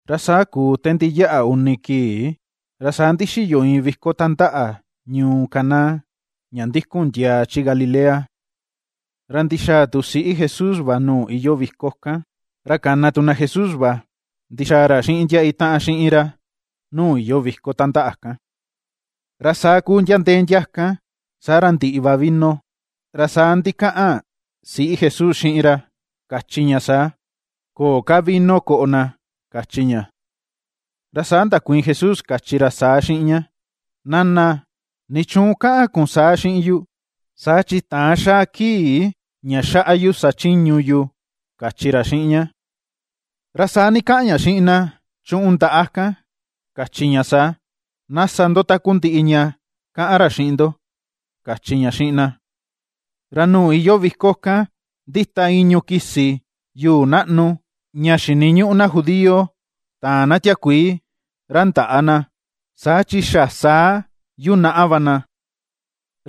Ra saa kuu te ndiyaꞌa uni kii, ra saa ndixiyo iin viko tandaꞌa ñuu Caná, ña ndikun ndiaa chi Galilea. Ra ndixaa tu siꞌí Jesús va nuu iyoo viko kan, ra kana tu na Jesús va ndixaa ra xiꞌin ndia itaꞌan xiꞌin ra nuu iyoo viko tandaꞌa kan. Ra saa kuu ndia ndee ndia kan saa ra ndiꞌi va vino, ra saa ndikaꞌan siꞌí Jesús xiꞌin ra kachi ña saa: ―Köo ka vino koꞌo na ―kachi ña̱. Ra saa ndakuiin Jesús kachi ra saa xiꞌin ña: ―Nana, ¿nichuun ^kaꞌan kun saa xiꞌin yu? Saa chi täan xa̱a̱ kii ña xaꞌa yu sachiñu yu ―kachi ra xiꞌin ña. Ra saa ndikaꞌan ña xiꞌin na chuꞌun ndaꞌa kan, kachi ña saa: ―Na sa ndo takundiꞌi ña ^kaꞌan ra xiꞌin ndo ―kachi ña xiꞌin na. Ra nuu iyoo viko kan ndita i̱ñu̱ kisi yuu naꞌnu, ña xiniñuꞌu na judío taan na tiakuii ra ndaꞌa na, saa chi xa saa yunaꞌa va na.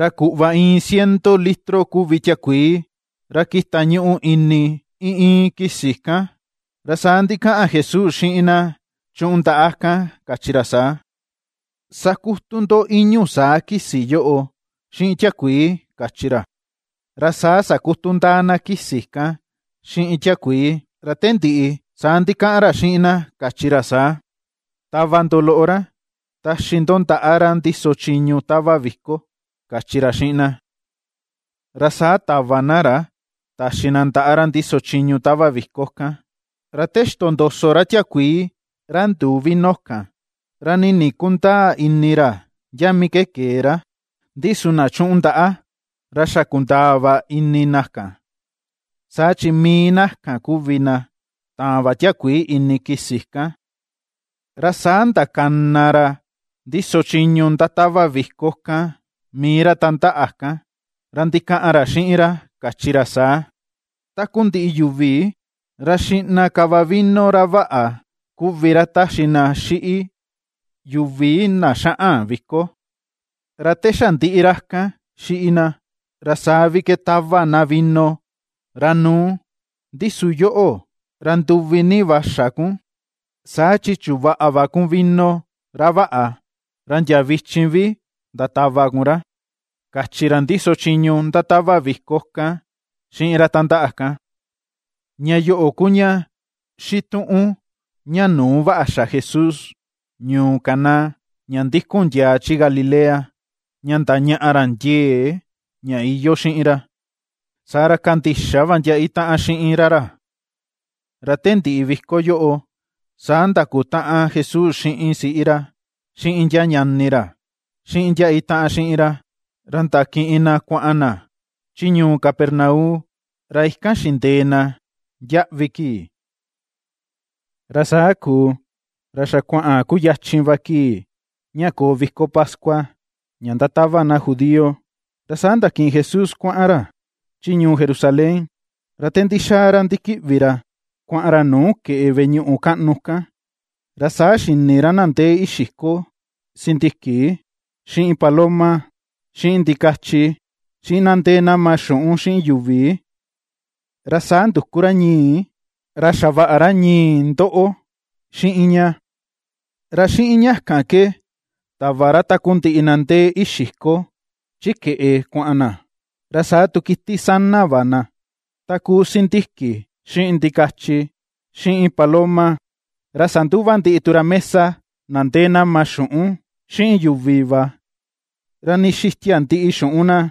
Ra kuꞌva iin ciento litro kuvi tiakuii ra kita ñuꞌu ini iin iin kisi kan. Ra saa ndikaꞌan Jesús xiꞌin na chuꞌun ndaꞌa kan kachi ra saa: ―Sakutu ndo i̱ñu̱ saa kisi yoꞌo xiꞌin tiakuii ―kachi ra. Ra saa sakutu ndáá na kisi kan xiꞌin tiakuii. Ra te ndiꞌi saa ndikaꞌan ra xiꞌin na kachi ra saa: ―Tava ndo loꞌo rá, taxi ndo ndaꞌa ra ndíso chiñu tava viko ―kachi ra xiꞌin na. Ra saa tava na rá taxi na ndaꞌa ra ndiso chiñu tava viko kan. Ra te ixtondoso ra tiakuii ra nduu vino kan, ra nii ndikundäa ini ra ndia mii ke kee ra, ndi su na chuꞌun ndaꞌa ra xa kundaa va ini na kan, saa chi mii na kan kuvi na taan va tiakuii ini kisi kan. Ra saa ndakana ra ndíso chiñu ndatava viko kan mii ra tandaꞌa kan, ra ndikaꞌan ra xiꞌin ra kachi ra saa: ―Takundiꞌi yuvi ra xiꞌna ka va vino ra váꞌa, kuvi ra taxi na xiꞌi yuvi na xaꞌan viko, ra te xa ndiꞌi ra kan xiꞌi na, ra saa vi ke tava na vino ra nu̱u. Ndi su yoꞌo, ra nduvi ni va xa kun saa chi chuvaꞌa va kun vino ra vaꞌa, ra ndia vichin vi ndatava kun ra ―kachi ra ndiso chiñu ndatava viko kan xiꞌin ra tandaꞌa kan. Ña yoꞌo ku ña xituꞌun ña nuu vaꞌa xa Jesús ñuu Caná, ña ndikun ndiaa chi Galilea, ña ndañaꞌa ra ndiee ña iyoo xiꞌin ra, saa ra kandixa va ndia itaꞌan xiꞌin ra ra. Ra te ndiꞌi viko yoꞌo, saa ndakutaꞌan Jesús xiꞌin siꞌi ra, xiꞌin ndia ñani ra, xiꞌin ndia itaꞌan xiꞌin ra; ra ndakiꞌin na kuaꞌan na chi ñuu Capernaum, ra ikan xindee na ndiaꞌvi kii. Ra saa kuu ra xa kuaꞌan kuyachin va kii ña koo viko pascua, ña ndatava na judío, ra saa ndakiꞌin Jesús kuaꞌan ra chi ñuu Jerusalén. Ra te ndixaa ra ndikiꞌvi ra kuaꞌan ra nuu keꞌe veꞌe ñuꞌu kaꞌnu kan, ra saa xini ra na ndee ixiko sindiki, xiꞌin paloma, xiꞌin ndikachi, xiꞌin na ndéé ^nama xuꞌun xiꞌin yu̱vi. Ra saa nduku ra ñii, ra xavaꞌa ra ñii ndoꞌo xiꞌin ña, ra xiꞌin ña kan ke tava ra takundiꞌi na ndee ixiko chi keꞌe kuaꞌan na, ra saa tu kiti sana va na, ta kuu sindiki xiꞌin ndikachi, xiꞌin paloma. Ra sanduva ndiꞌi tu ra mesa na ndee nama xuꞌun xiꞌin yuvi va, ra ndixitia ndiꞌi xuꞌun na.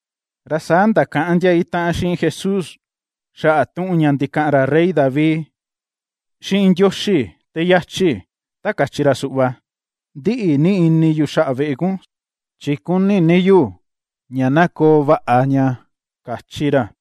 Ra saa ndakaꞌan ndia itaꞌan xiꞌin Jesús xaꞌa tuꞌun ña ndikaꞌan ra rey David xiꞌin Ndioxi te yachi ta kachi ra suꞌva: “^Ndiꞌi ni ini yu xaꞌa veꞌe kun chi kuni ni yu ña na koo vaꞌa ña”, kachi ra.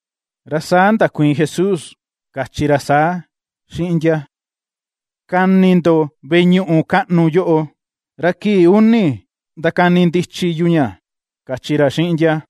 Ra saa ndakuiin Jesús kachi ra saa xiꞌin ndia: ―^Kani ndo veꞌe ñuꞌu kaꞌnu yóꞌo, ra kii uni ndakani ndichi yu ña ―kachi ra xiꞌin ndia.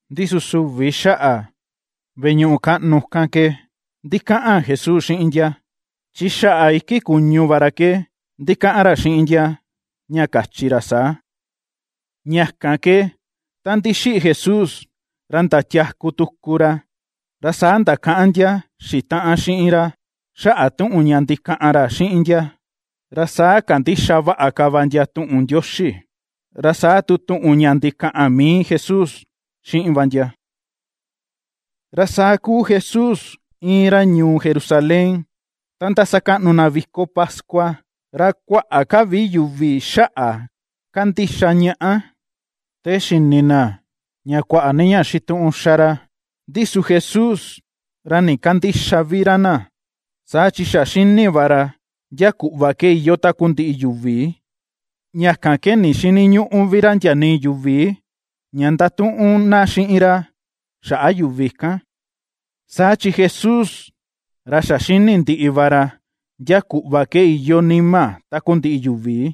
Ndi su süvi xaꞌa veꞌe ñuꞌu kaꞌnu kan ke ndikaꞌan Jesús xiꞌin ndia, chi xaꞌa iki kuñu va ra ke ndikaꞌan ra xiꞌin ndia, ña kachi ra saa. Ña kan ke ta ndixiꞌi Jesús ra ndatiaku tuku ra, ra saa ndakaꞌan ndia xitaꞌan xiꞌin ra xaꞌa tuꞌun ña ndikaꞌan ra xiꞌin ndia, ra saa kandixa vaꞌa ka va ndia tuꞌun Ndioxi, ra saa tu tuꞌun ña ndikaꞌan mii Jesús xiꞌin va ndia. Ra saa kuu Jesús íin ra ñuu Jerusalén ta ndasakaꞌnu na viko pascua, ra kuaꞌa ka vi yuvi xaꞌa ^kandixa ñaꞌa, te xini na ña kuaꞌa ni ña xituꞌun xa ra. Ndi su Jesús ra ndikandïxa vi ra na, saa chi xa xíni̱ va ra ndia kuꞌva ke iyoo takundiꞌi yuvi. Ña kan ke ndixïniñuꞌu vi ra ndia nii yuvi ña ndatuꞌun na xiꞌin ra xaꞌa yuvi kan, saa chi Jesús ra xa xini ndiꞌi va ra ndia kuꞌva ke iyoo nima takundiꞌi yuvi.